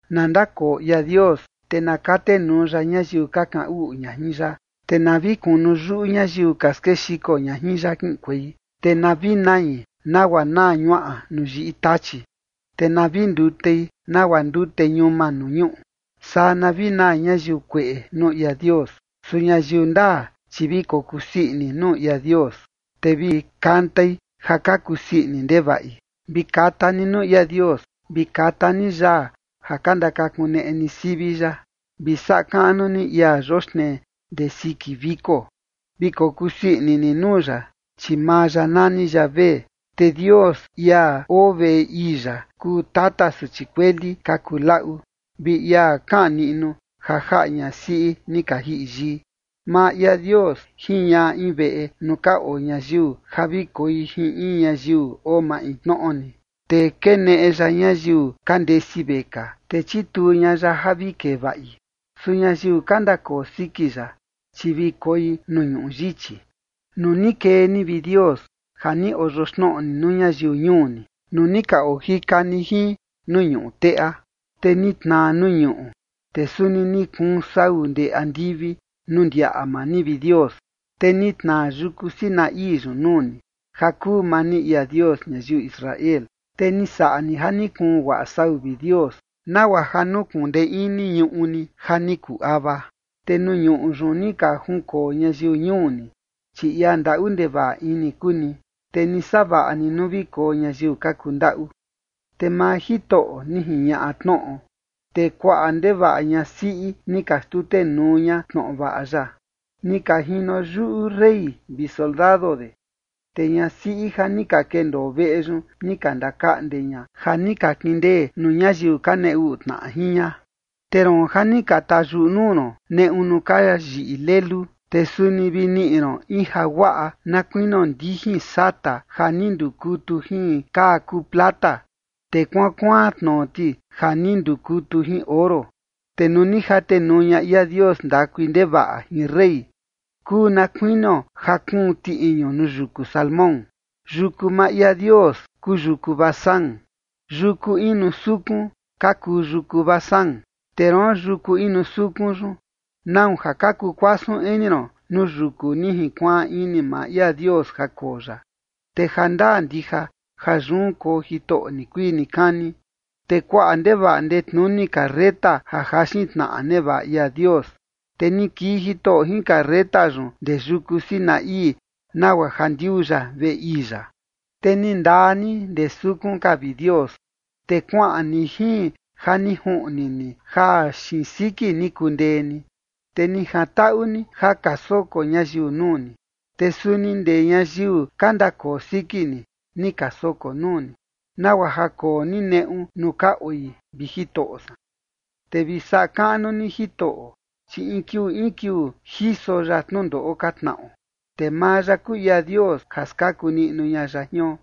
Na ndakoo ia Dios, te na katenuu ya ñayiu ka kaꞌan uꞌu ña jin ya, te na vi kunu yuꞌu ñayiu ka skexiko ña jin ya kiꞌinkuei. Te na vi nai nagua naa ñuaꞌa nuu yiꞌi tachi, te na vi ndutei nagua ndute ñuma nuu ñuꞌu. Saa na vi naa ñayiu kueꞌe nuu ia Dios. Su ñayiu ndaa, chi vi kokusii ini nuu ia Dios, te vi kantai ja ka kusii ini ndevaꞌi. Vi kata ni nuu ia Dios, vi kata ni yaa ja ka ndakakuneꞌe ni sivi ya, vi saꞌa kaꞌnu ni ia yoxnee ndee siki viko, vi kokusii ini ni nuu ya, chi maa ya nani Yavé. Te Dios, ia oo veꞌe ii ya, kuu tata suchi kueli ka kuu laꞌu, vi ia kaꞌan niꞌnu ja jaꞌa ñasiꞌi ni ka jiꞌi yii. Maa ia Dios jiñaꞌa in veꞌe nuu ka oo ñayiu ja vi koi jin in ñayiu oo maintnoꞌo ni, te keneꞌe ya ñayiu ka ndesi vekaa, te chituu ña ya ja vi kee vaꞌi. Su ñayiu ka ndakoo siki ya, chi vi koi nuu ñuꞌu yichi. Nuu ni kee ni, vi Dios, ja ni oyoxnoꞌo ni nuu ñayiu ñuu ni, nuu ni ka ojika ni jin nuu ñuꞌu teꞌa, te ni tnaa nuu ñuꞌu, te suni ni kuun sau ndee andivi nuu ndiaꞌa maa ni, vi Dios, te ni tnaa yuku Sinaí yun nuu ni, ja kuu maa ni ia Dios ñayiu Israel. Te ni saꞌa ni ja ni kuun guaꞌa sau, vi Dios, nagua ja nukuꞌun ndee ini ñuꞌu ni ja ni kuu ava. Te nuu ñuꞌu yun ni ka junkoo ñayiu ñuu ni, chi ia ndaꞌu ndevaꞌa ini kuu ni, te ni savaꞌa ni nuu vi koo ñayiu ka kundaꞌu. Te maa Jitoꞌo ni jiñaꞌa tnoꞌo, te kuaꞌa ndevaꞌa ñasiꞌi ni ka xtutenuu ña tnoꞌo vaꞌa ya. Ni ka jino yuꞌu rey vi soldado de, te ñasiꞌi ja ni ka kendoo veꞌe yun ni ka ndakaꞌnde ña ja ni ka kindee nuu ñayiu ka nee uꞌu tnaꞌa jin ña. Te roon ja ni ka tayuꞌu nuu ron neꞌu nuu ka yiꞌi lelu, te suni vi niꞌi ron in jaguaꞌa na kuinio ndijin sata ja ni ndukutu jin kaa kuu plata te kuaan kuaan tnoo ti ja ni ndukutu jin oro. Te nuu ni jatenuu ña ia Dios ndakui ndevaꞌa jin rey, kuu na kuinio ja kuun tiꞌiñu nuu yuku Salmón. Yuku maa ia Dios kuu yuku Basán, yuku inu sukun ka kuu yuku Basán. Te roon yuku inu sukun yun, ¿nau ja ka kukuasun ini ron nuu yuku ni jinkuaan ini maa ia Dios ja koo ya? Te jandaa ndija ja yun koo Jitoꞌo nikuii nikani. Te kuaꞌa ndevaꞌa ndetnuni carreta ja jaxin tnaꞌa nevaꞌa ia Dios, te ni kii Jitoꞌo jin carreta yun ndee yuku Sinaí nagua ja ndiuu ya veꞌe ii ya. Te ni ndaa ni ndee sukun ka, vi Dios, te kuaꞌan ni jin ja ni juꞌni ni ja xiin siki ni kundee ni, te ni jantaꞌu ni ja ka soko ñayiu nuu ni, te suni ndee ñayiu ka ndakoo siki ni, ni ka soko nuu ni, nagua ja koo ni neꞌu nuu ka oi, vi Jitoꞌo san. Te vi saꞌa kaꞌnu ni Jitoꞌo, chi in kiuu in kiuu jiso ya tnundoꞌo ka tnaꞌo, te maa ya kuu ia Dios ja skaku niꞌnu ña ya jion.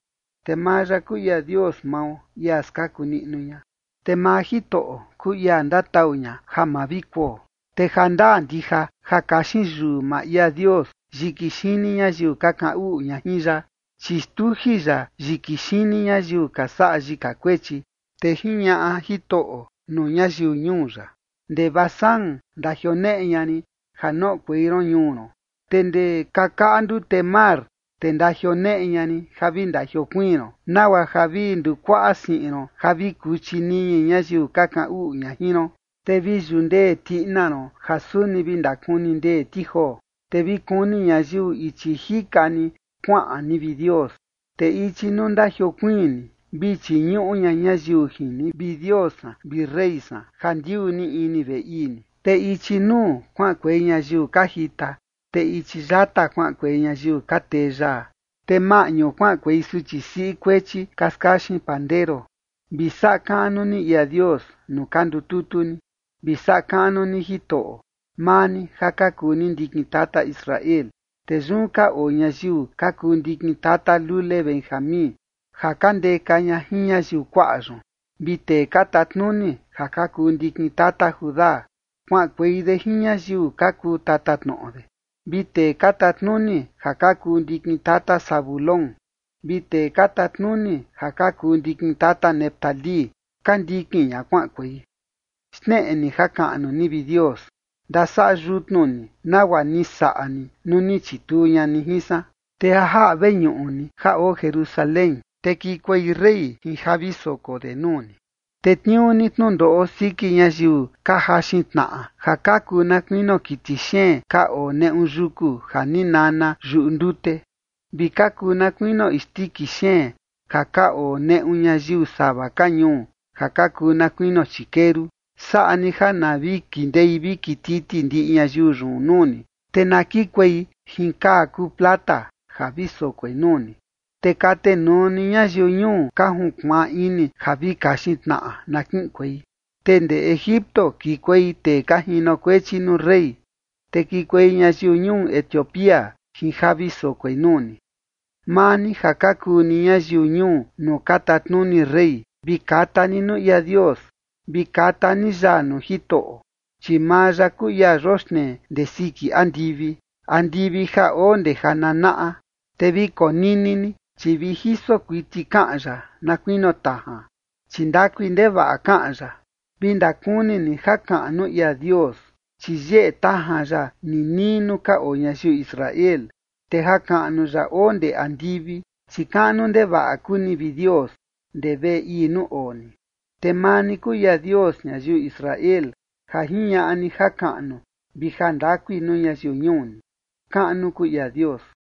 Te maa ya kuu ia Dios mao, ia skaku niꞌnu ña, te maa Jitoꞌo kuu ia ndatau ña ja ma vi kuo. Te jandaa ndija ja kaxin yuu maa ia Dios yiki xini ñayiu ka kaꞌan uꞌu ña jin ya, chi xtuji ya yiki xini ñayiu ka saꞌa yika kuechi. Te jiñaꞌa Jitoꞌo nuu ñayiu ñuu ya: “Ndee Basán ndajioneꞌe ña rin ja noꞌokuei ron ñuu ron, te ndee kakaꞌa ndute mar, te ndajioneꞌe ña rin ja vi ndajiokuiin ron, nagua ja vi ndukuaꞌa siꞌin ron ja vi kuchi niñi ñayiu ka kaꞌan uꞌu ña jin ron, te vi yundee tiꞌina ron ja suni vi ndakuni ndee ti joo”. Te vi kuni ñayiu ichi jika ni kuaꞌan ni, vi Dios, te ichi nuu ndajiokuiin ni, vi chiñuꞌu ña ñayiu jin ni, vi Dios san vi rey san, ja ndiuu ni ini veꞌe ii ni. Te ichi nuu, kuaꞌankuei ñayiu ka jita, te ichi yata kuaꞌankuei ñayiu ka tee yaa, te maꞌñu kuaꞌankuei suchi siꞌi kuechi ka skaxin pandero. Vi saꞌa kaꞌnu ni ia Dios nuu ka ndututu ni, vi saꞌa kaꞌnu ni Jitoꞌo, maa ni ja ka kuu ni ndikin tata Israel. Te yun ka oo ñayiu ka kuu ndikin tata lule Benjamín, ja ka ndeka ña jin ñayiu kuaꞌa yun, vi tee ka tatnuni ja ka kuu ndikin tata Judá, kuaꞌankuei de jin ñayiu ka kuu tatatnoꞌo de, vi tee ka tatnuni ja ka kuu ndikin tata Zabulón, vi tee ka tatnuni ja ka kuu ndikin tata Neftalí, ka ndikin ña kuaꞌankuei. Xneꞌe ni jakaꞌnu ni, vi Dios, ndasaꞌa yutnu ni nagua ni saꞌa ni nuu ni chituu ña ni jin san. Te ja jaꞌa veñuꞌu ni ja oo Jerusalén, te kikuei rey jin ja vi soko de nuu ni. Tetniuu ni tnundoꞌo siki ñayiu ka jaxin tnaꞌa ja ka kuu na kuinio kiti xeen ka oo neꞌu yuku ja ni nana yuꞌu ndute, vi ka kuu na kuinio isndiki xeen ja ka oo neꞌu ñayiu sava ka ñuu ja ka kuu na kuinio chikeru. Saꞌa ni ja na vi kindei vi kititi ndiꞌi ñayiu yun nuu ni, te na kikuei jin kaa kuu plata ja vi sokoi nuu ni. Te katenuu ni ñayiu ñuu ka junkuaan ini ja vi kaxin tnaꞌa, na kiꞌinkuei. Te ndee Egipto kikuei tee ka jinokuechi nuu rey, te kikuei ñayiu ñuu Etiopía jin ja vi sokoi nuu ni. Maa ni ja ka kuu ni ñayiu ñuu nuu ka tatnuni rey, vi kata ni nuu ia Dios, vi kata ni yaa nuu Jitoꞌo. Chi maa ya kuu ia yoxnee ndee siki andivi, andivi ja oo ndee ja nanaꞌa. Te vi konini ni, chi vi jiso kuiti kaꞌan ya na kuinio tajan, chi ndakui ndevaꞌa kaꞌan ya. Vi ndakuni ni jakaꞌnu ia Dios, chi yeꞌe tajan ya ninii nuu ka oo ñayiu Israel, te jakaꞌnu ya oo ndee andivi. Chi kaꞌnu ndevaꞌa kuu ni, vi Dios, ndee veꞌe ii nuu oo ni, te maa ni kuu ia Dios ñayiu Israel ja jiñaꞌa ni jakaꞌnu vi jandakui nuu ñayiu ñuu ni. Kaꞌnu kuu ia Dios.